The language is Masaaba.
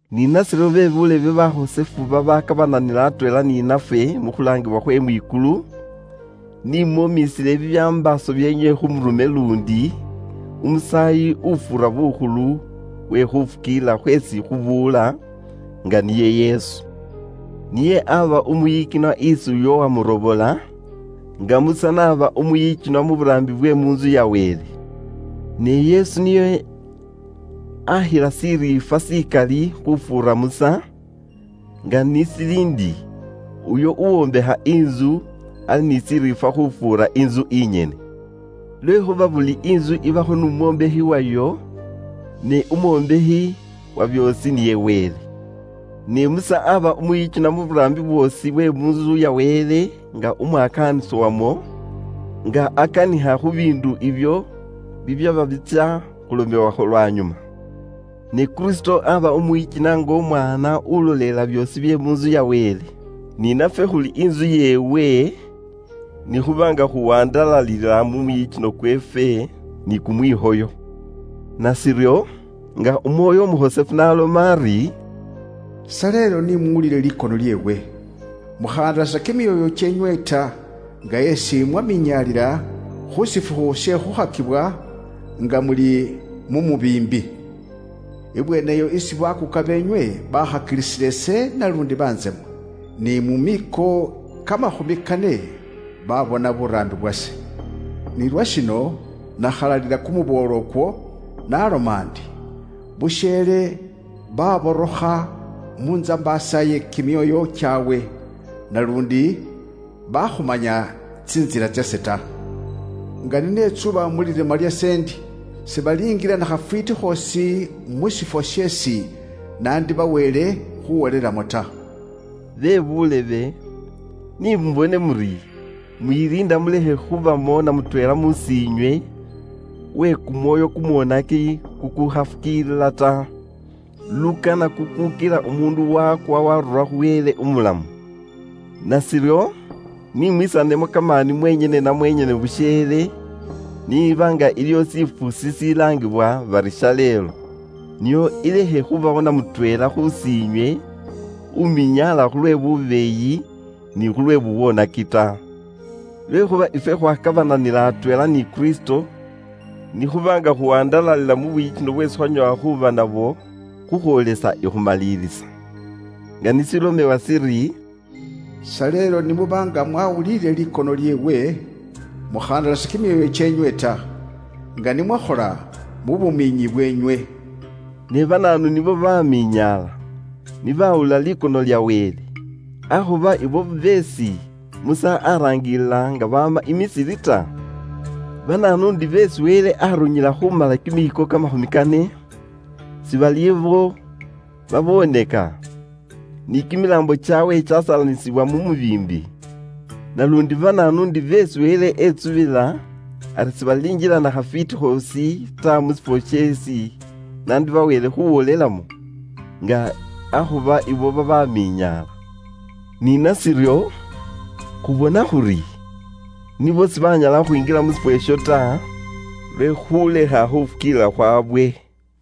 Ni nashiryo be buulebe bakhosefu babakabananila atweela ni nafwe mu khulaangibwa khwe mwikulu, ni mwomisile bibyambaaso byeenywe khu murume luundi umusaayi ufuura bukhulu uwe khufukiilila khweesi khubuula, nga niye Yesu. Niye aba umwiyikinwa isi uyo uwamurobola, nga Musa n'aba umwiyikinwa mu buraambi bwe mu ntsu ya Wele. Ne Yesu niye akhila shiriifwa shikali khufuura Musa, nga ni shili ndi, uyo uwombekha intsu ali ni shiriifwa khufuura intsu inyene. Lwekhuuba buli intsu ibakho n'umwombakhi wayo, ne umwombakhi wa byoosi niye Wele. Ne Musa aaba umwiyikinwa mu buraambi bwoosi bwe mu ntsu ya Wele nga umwakaanisi wamwo, nga akanikha khu biindu ibyo bibyaba bitsya khulomewakho lwanyuma. Ne Kristo aaba umwiyikinwa nga Umwaana ulolelela byoosi bye mu ntsu ya Wele. Ni nafwe khuli intsu yeewe, ni khuba nga khuwandalalila mu mwiyikino kweefwe ni kumwikhoyo. Nashiryo, nga Umwoyo Umukhosefu n'aloma ari, “Shaleelo ni muwulile likono lyeewe. Mukhahandalasa kimyoyo kyeenywe ta, nga esi mwaminyaalila khu shifukhu she khukhakibwa nga muli mu mubiimbi. Ibweeneyo esi bakuuka beenywe bakhakilisila ise luundi bantsema, ni mu miiko kamakhumi kane babona buraambi bwase. Nilwa shino nakhalalila kumuboolo ukwo, naloma ndi, ‘busheele baborokha mu ntsambaasa ye kimyoyo kyaabwe, naluundi baakhumanya tsintsila tsase ta.’ Nga ni netsuba mu lirima lyase ndi, ‘Sibalingila nakhafwiiti khoosi mu shifwo sheesi nandibaweele khuwolelamo ta.’” Bebuulebe, ni mubone muri, mwiliinda mulekhe khubamo na mutweela mus'iinywe uwe kumwoyo kumwonaki kukukhafukiilila ta, lukana kukukila umuundu wakwa waarura khu Wele umulamu. Nashiryo, ni mwisanemo kamaani mwenyene na mwenyene busheele, niiba nga iliyo shifukhu shishilaangibwa bari, “Shaleelo.” Nio ilekhe khubawo na mutweela khus'inywe uminyaala khulwe bubeeyi ni khulwe bubwoonaki ta. Lwekhuuba ifwe khwakabananila atweela ni Kristo, ni khuba nga khuwandalalila mu bwiyikino bweesi khwanyoowa khuuba nabwo, khukhwoolesa ikhumalilisa. Nga ni shilomewa shiri, “Shaleelo ni muba nga mwawuliile likono lyeewe, mukhahandalasa kimyoyo kyeenywe ta, nga ni mwakhola mu bumiinyi bweenywe.” Ne banaanu nibo babaaminyaala ni baawulila likono lya Wele? Akhuba abo beesi Musa araangilila nga baama i Misiri ta? Banaanu ndi beesi Wele aarunyila khuumala kimiiko kamakhumi kane? Si bali abo baboonaka ta, ni kimilaambo kyaabwe kyasalanisibwila mu mubiimbi ta? Naluundi banaanu ndi beesi Wele etsubila ari sibalinjila na khafwiiti khoosi ta mu shifwo sheesi nandibaweele khuwolelamo, nga akhuba abo babaaminyaala? Ni nashiryo, khubona khuri, nibo sibaanyala khukhwinjila mu shifwo isho ta, lwe khulekha khufukiilila khwawe.